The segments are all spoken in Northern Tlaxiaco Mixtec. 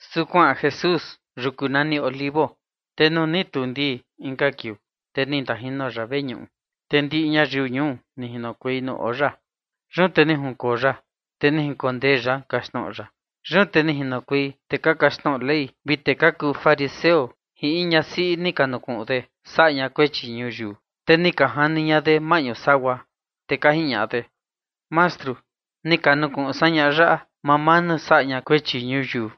Su kuaꞌan Jesús yuku nani Olivo. Te nuu ni tuu ndii inka kiuu, te ni ndajino ya veñuꞌu, te ndiꞌi ñayiu ñuu ni jinokuei nuu oo ya. Yun te ni junkoo ya, te ni jinkondee ya kaxtnoꞌo ya. Yun te ni jinokuei tee ka kaxtnoꞌo Ley vi tee ka kuu fariseo jin in ñasiꞌi ni ka nukuꞌun de saꞌa ña kuechi ñuyiu, te ni ka jani ña de maꞌñu sagua. Te ka jiñaꞌa de: ―Mastru, ni ka nukuꞌun san ñaꞌa yaꞌa mamaa nuu saꞌa ña kuechi ñuyiu.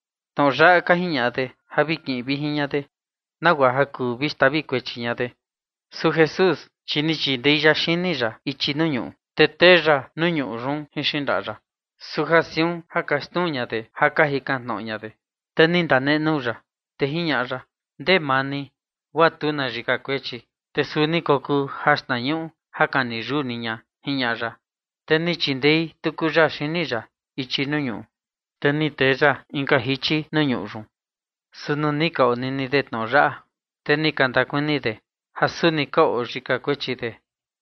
Tnoꞌo yaꞌa ka jiñaꞌa de ja ka kiꞌin vijin ña de, nagua ja kuu vi xtavi kuechi ña de. Su Jesús, chi ni chindei ya xini ya ichi nuu ñuꞌu, te tee ya nuu ñuꞌu yun jin xindaꞌa ya. Su ja siun ka xnuu ña de ja ka jikan tnoꞌo ña de, te ni ndanenuu ya, te jiñaꞌa ya: ―Ndee maa ni guaa tu na yika kuechi, te suu ni kokuu jaxtnañuꞌu ja kani yuu ni ña ―jiñaꞌa ya. Te ni chindei tuku ya xini ya ichi nuu ñuꞌu, te ni tee ya inka jichi nuu ñuꞌu yun. Su nuu ni ka onini de tnoꞌo yaꞌa, te ni ka ndakuni de ja suni ka oo yika kuechi de,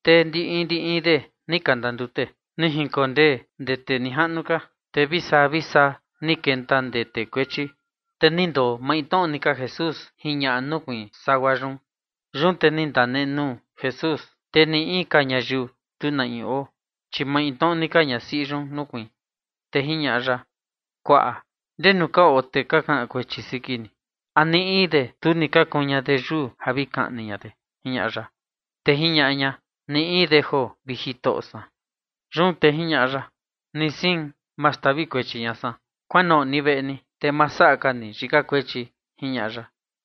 te ndi in ndi in de ni ka ndandute, ni jinkondee ndee tee nijaꞌnu ka, te vi saa vi saa ni kenta ndee tee kuechi, te ni ndoo maintnoꞌo ni ka Jesús jin ñaꞌa nukuiin sagua yun. Yun te ni ndanenuu Jesús, te ni in ka ñayiu tu na in oo, chi maintnoꞌo ni ka ñasiꞌi yun nukuiin, te jiñaꞌa ya: ―Kuaꞌa, ¿ndenu ka oo tee ka kaꞌan kuechi siki ni? ¿A ni in de tu ni ka kuun ña de yuu ja vi kaꞌni ña de? ―jiñaꞌa ya. Te jiñaꞌa ña: ―Ni in de joo, vi Jitoꞌo san. Yun te jiñaꞌa ya: ―Ni sein, ma xtavi kuechi ña san. Kuanoꞌo ni veꞌe ni, te ma saꞌa ka ni yika kuechi ―jiñaꞌa ya.]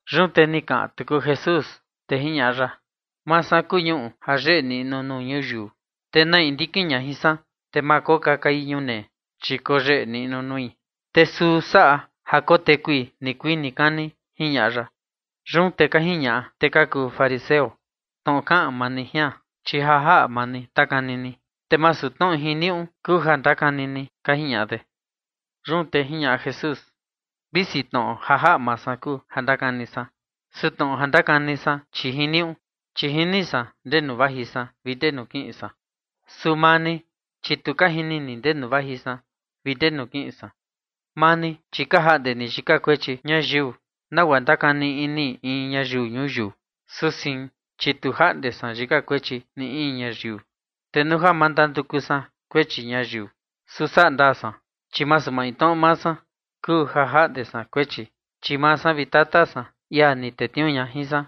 Yun te ni kaꞌan tuku Jesús, te jiñaꞌa ya: ―Maa san kuu ñuꞌu ja yeꞌe niꞌnu nuu ñuyiu, te na in ndikin ña jin san, te ma kokakai ñunee, chi koyeꞌe niꞌnu nui, te suu saꞌa ja kotekui nikuii nikani ―jiñaꞌa ya. Yun te ka jiñaꞌa tee ka kuu fariseo: ―Tnoꞌo kaꞌan ni jian, chi ja jaꞌa maa ni ndakani ni, te masu tnoꞌo jiniuꞌu kuu ja ndakani ni ―ka jiñaꞌa de. Yun te jiñaꞌa Jesús: ―Visi tnoꞌo ja jaꞌa maa san kuu ja ndakani san, su tnoꞌo ja ndakani san, chi jiniuꞌu, chi jini san ndenu vaji san vi ndenu kiꞌin san. Su maa ni, chi tu ka jini ni ndenu vaji san vi ndenu kiꞌin san. Maa ni, chi ka jaꞌnde ni yika kuechi ñayiu nagua ndakani ini in ñayiu ñuyiu, su sein, chi tu jaꞌnde san yika kuechi ni in ñayiu. Te nuu ja na ndanduku san kuechi ñayiu, su saꞌa ndaa san, chi masu maintnoꞌo maa san kuu ja jaꞌnde san kuechi, chi maa san vi Tata san, ia ni tetniuu ña jin san.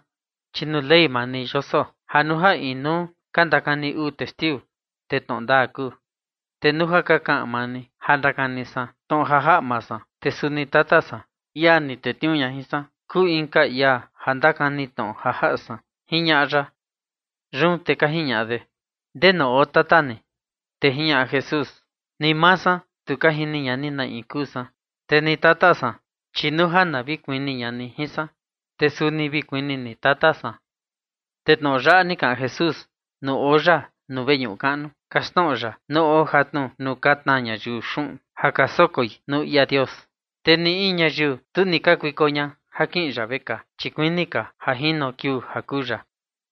Chi nuu Ley maa ni yoso ja nuu ja inuu ka ndakani uu testiu, te tnoꞌo ndaa kuu. Te nuu ja ka kaꞌan maa ni ja ndakani san tnoꞌo ja jaꞌa maa san, te suni Tata san, ia ni tetniuu ña jin san, kuu inka ia ndakani tnoꞌo ja jaꞌa san ―jiñaꞌa ya. Yun te ka jiñaꞌa de: ―¿Ndenu oo tata ni? Te jiñaꞌa Jesús: ―Ni maa san, tu ka jini ña ni na in kuu san, te ni Tata san, chi nuu ja na vi kuni ña ni jin san, te suni vi kuni ni Tata san. Te tnoꞌo yaꞌa ni kaꞌan Jesús nuu oo ya nuu veñuꞌu kaꞌnu kaxtnoꞌo ya nuu oo jatnu nuu ka tnaa ñayiu xuꞌun ja ka sokoi nuu ia Dios. Te ni in ñayiu tu ni ka kakuiko ña ja kiꞌin ya vekaa, chi kuini ka ja jino kiuu ja kuu ya.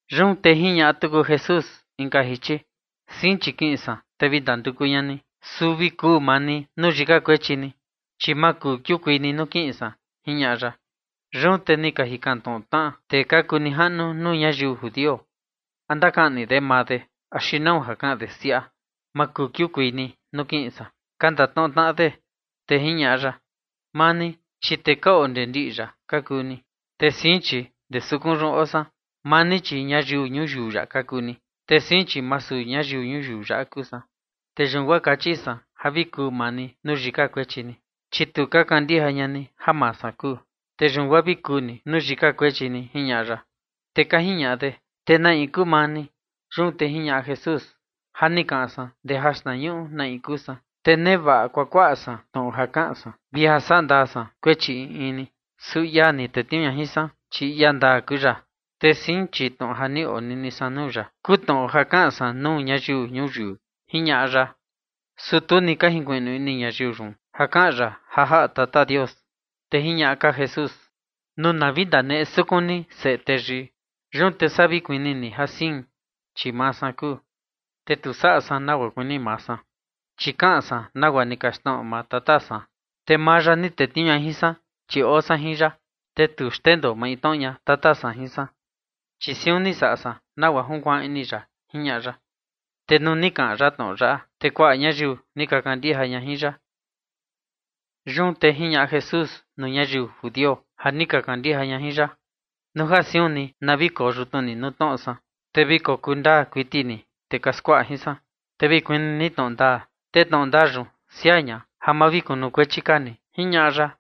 Yun te jiñaꞌa tuku Jesús inka jichi: ―Sein, chi kiꞌin san, te vi ndanduku ña ni, su vi kuu maa ni nuu yika kuechi ni, chi ma kuu kiukuei ni nuu kiꞌin san ―jiñaꞌa ya. Yun te ka jikan tnoꞌo tnaꞌa tee ka kuu nijaꞌnu nuu ñayiu judio: ―¿A ndakaꞌni de maa de axi nau ja kaꞌan de siaꞌa: “Ma kuu kiukuei ni nuu kiꞌin san”? ―ka ndatnoꞌo tnaꞌa de. Te jiñaꞌa ya: ―Maa ni, chi tee ka oo ndee ndiꞌi yaꞌa ka kuu ni, te sein, chi ndee sukun yun oo san. Maa ni, chi ñayiu ñuyiu yaꞌa ka kuu ni, te sein, chi masu ñayiu ñuyiu yaꞌa kuu san. Te yun guaa kachi san ja vi kuu maa ni nuu yika kuechi ni, chi tu ka kandija ña ni ja Maa San Kuu, te yun guaa vi kuu ni nuu yika kuechi ni ―jiñaꞌa ya. Te ka jiñaꞌa de: ―¿Te na in kuu maa ni? Yun te jiñaꞌa Jesús: ―Ja ni kaꞌan san ndee jaxtnañuꞌu na in kuu san. Te nevaꞌa kuakuaꞌa san tnoꞌo ja kaꞌan san vi ja saꞌa ndaa san kuechi in in ni, su ia ni tetniuu ña jin san, chi ia ndaa kuu ya. Te sein, chi tnoꞌo ja ni onini san nuu ya kuu tnoꞌo ja kaꞌan san nuu ñayiu ñuyiu ―jiñaꞌa ya. Su tu ni ka jinkuiꞌnu ini ñayiu yun ja kaꞌan ya ja jaꞌa Tata Dios. Te jiñaꞌa ka Jesús: ―Nuu na vi ndaneꞌe sukun ni Seꞌe Teyii, yun te saa vi kuni ni ja sein, chi Maa San Kuu, te tu saꞌa san nagua kuini maa san, chi kaꞌan san nagua ni kaxtnoꞌo maa Tata san. Te maa ya ni tetniuu ña jin san, chi oo ya jin san, te tu xndoo maintnoꞌo ña Tata san jin san, chi siun ni saꞌa san nagua junkuaan ini ya ―jiñaꞌa ya. Te nuu ni kaꞌan ya tnoꞌo yaꞌa, te kuaꞌa ñayiu ni ka kandija ña jin ya. Yun te jiñaꞌa Jesús nuu ñayiu judio ja ni ka kandija ña jin ya: ―Nuu ja siun ni vi koo yutnu ni nuu tnoꞌo san, te vi kokuu ndaa kuiti ni tee ka skuaꞌa jin san. Te vi kuni ni tnoꞌo ndaa, te tnoꞌo ndaa yun siaa ña ja ma vi kunukuechi ka ni ―jiñaꞌa ya.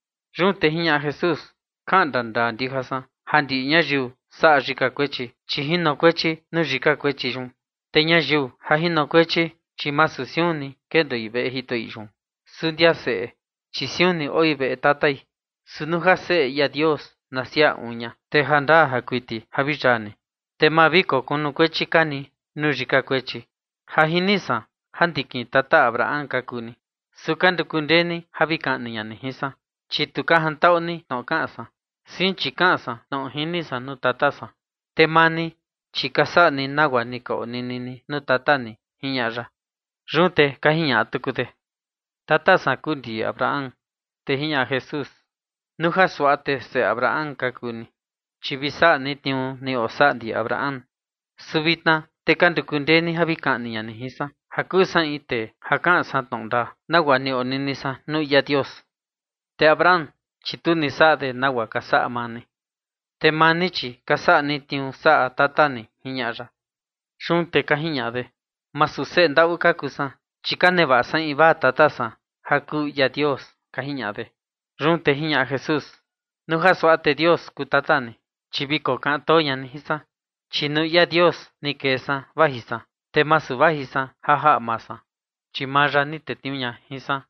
Yun te jiñaꞌa Jesús: ―Kaꞌan ndandaa ndija san ja ndiꞌi ñayiu saꞌa yika kuechi, chi jinokuechi nuu yika kuechi yun. Te ñayiu ja jinokuechi, chi masu siun ni kendoi veꞌe jitoꞌi yun, su ndia seꞌe, chi siun ni oi veꞌe tatai. Su nuu ja Seꞌe ia Dios na siaa uun ña, te jandaa kuiti ja vi yaa ni, te ma vi kokunukuechi ka ni nuu yika kuechi. Ja jini san ja ndikin tata Abraham ka kuu ni, su ka nduku ndee ni ja vi kaꞌni ña ni jin san, chi tu ka jantaꞌu ni tnoꞌo kaꞌan san. Sein, chi kaꞌan san tnoꞌo ja jini san nuu Tata san, te maa ni, chi ka saꞌa ni nagua ni ka onini ni nuu tata ni ―jiñaꞌa ya. Yun te ka jiñaꞌa tuku de: ―Tata san kuu ndi Abraham. Te jiñaꞌa Jesús: ―Nuu ja suaꞌa te seꞌe Abraham ka kuu ni, chi vi saꞌa ni tniuu ni osaꞌa ndi Abraham. Su vitna te ka nduku ndee ni ja vi kaꞌni ña ni jin san, ja kuu san in tee ja kaꞌan san tnoꞌo ndaa, nagua ni onini san nuu ia Dios. Te Abraham, chi tu ni saꞌa de nagua ka saꞌa maa ni. Te maa ni, chi ka saꞌa ni tniuu saꞌa tata ni ―jiñaꞌa ya. Yun te ka jiñaꞌa de: ―Masu seꞌe ndaꞌu ka kuu san, chi ka nevaꞌa san invaa tata san ja kuu ia Dios ―ka jiñaꞌa de. Yun te jiñaꞌa Jesús: ―Nuu ja suaꞌa te Dios kuu Tata ni, chi vi kokaꞌan too ña ni jin san, chi nuu ia Dios ni kee san vaji san, te masu vaji san ja jaꞌa maa san, chi maa ya ni tetniuu ña jin san.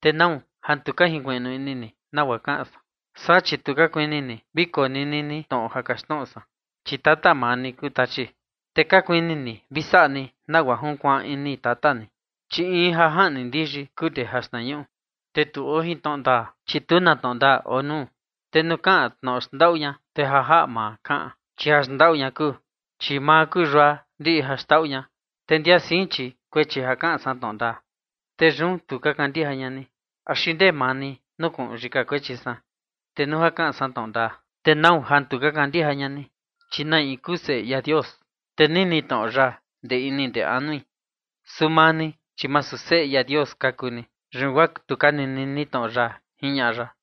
¿Te nau ja tu ka jinkuiꞌnu ini ni nagua kaꞌan san? Saa, chi tu ka kuini ni vi konini ni tnoꞌo ja kaxtnoꞌo san. Chi tata maa ni kuu Tachi, te ka kuini ni vi saꞌa ni nagua junkuaan ini tata ni, chi in ja jaꞌni ndiyi kuu ndee jaxtnañuꞌu. Te tu oo jin tnoꞌo ndaa, chi tu na tnoꞌo ndaa oo nuu. Te nuu kaꞌan tnoꞌo ja xndaꞌu ña, te ja jaꞌa maa kaꞌan, chi jaxndaꞌu ña kuu, chi maa kuu yua ndiꞌi jaxndaꞌu ña. Te ndia sein, chi chia kaꞌan san tnoꞌo ndaa, te yun tu ka kandija ña ni. ¿Axi ndee maa ni nukuꞌun yika kuechi san? Te nuu ja kaꞌan san tnoꞌo ndaa, ¿te nau ja tu ka kandija ña ni? Chi na in kuu Seꞌe ia Dios, te nini tnoꞌo ya ndee ini ndee anui. Su maa ni, chi masu Seꞌe ia Dios ka kuu ni, yun guaa tu ka nini ni tnoꞌo ya ―jiñaꞌa ya.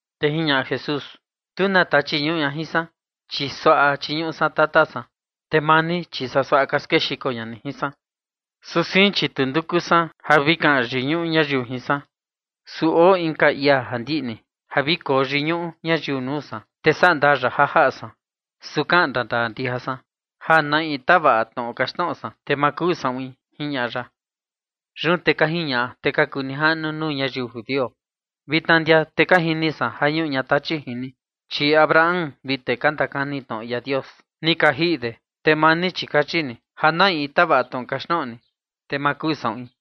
Te jiñaꞌa Jesús: ―Tu na tachi ñuꞌu ña jin san, chi suaꞌa chiñuꞌu san Tata san, te maa ni, chi saa suaꞌa ka skexiko ña ni jin san. Su sein, chi tu nduku san ja vi kaꞌan yiñuꞌu ñayiu jin san. Su oo inka ia ja ndiꞌni ja vi koo yiñuꞌu ñayiu nuu san, te saꞌa ndaa ya ja jaꞌa san. Su kaꞌan ndandaa ndija san, ja na in tavaꞌa tnoꞌo ja kaxtnoꞌo san, te ma kuu saꞌuin ―jiñaꞌa ya. Yun te ka jiñaꞌa tee ka kuu nijaꞌnu nuu ñayiu judio: ―Vitna ndia te ka jini san ja ñuꞌu ña tachi jin ni, chi Abraham vi tee ni ka ndakani tnoꞌo ia Dios ni ka jiꞌi de, te maa ni, chi kachi ni ja na in tavaꞌa tnoꞌo ja kaxtnoꞌo ni, te ma kuu saꞌuin.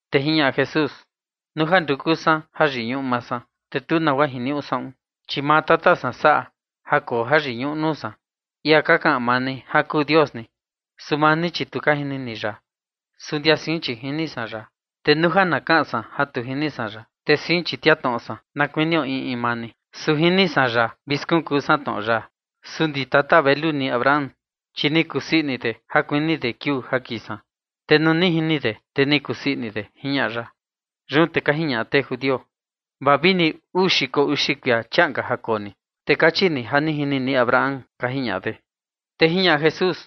Te jiñaꞌa Jesús: ―Nuu ja nduku san jayiñuꞌu maa san, te tu nagua jiniuꞌu saꞌun, chi maa Tata san saꞌa ja koo jayiñuꞌu nuu san, ia ka kaꞌan maa ni ja kuu Dios ni. Su maa ni, chi tu ka jini ni ya, su ndia sein, chi jini san ya, te nuu ja na kaꞌan san ja tu jini san ya, te chia tnoꞌo san, na kuinio in in maa ni. Su jini san ya vi skunkuu san tnoꞌo ya. Su ndi tata velu ni Abraham, chi ni kusii ini de ja kuni de kiuu ja kii san. Te nuu ni jini de, te ni kusii ini de ―jiñaꞌa ya. Yun te ka jiñaꞌa tee judio: ―Vaa vini uu xiko uxi kuia chiaꞌan ka ja koo ni, te kachi ni ja ni jini ni Abraham ―ka jiñaꞌa de. Te jiñaꞌa Jesús: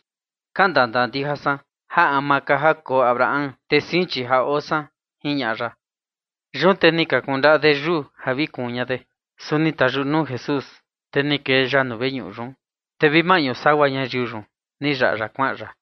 ―Kaꞌan ndandaa ndija san ja ama ka ja koo Abraham, te sein, chi ja oo san ―jiñaꞌa ya. Yun te ni ka kundaꞌa de yuu ja vi kuun ña de, su ni tayuꞌu nuu Jesús, te ni kee ya nuu veñuꞌu yun, te vi maꞌñu sagua ñayiu yun ni yaꞌa ya kuaꞌan ya.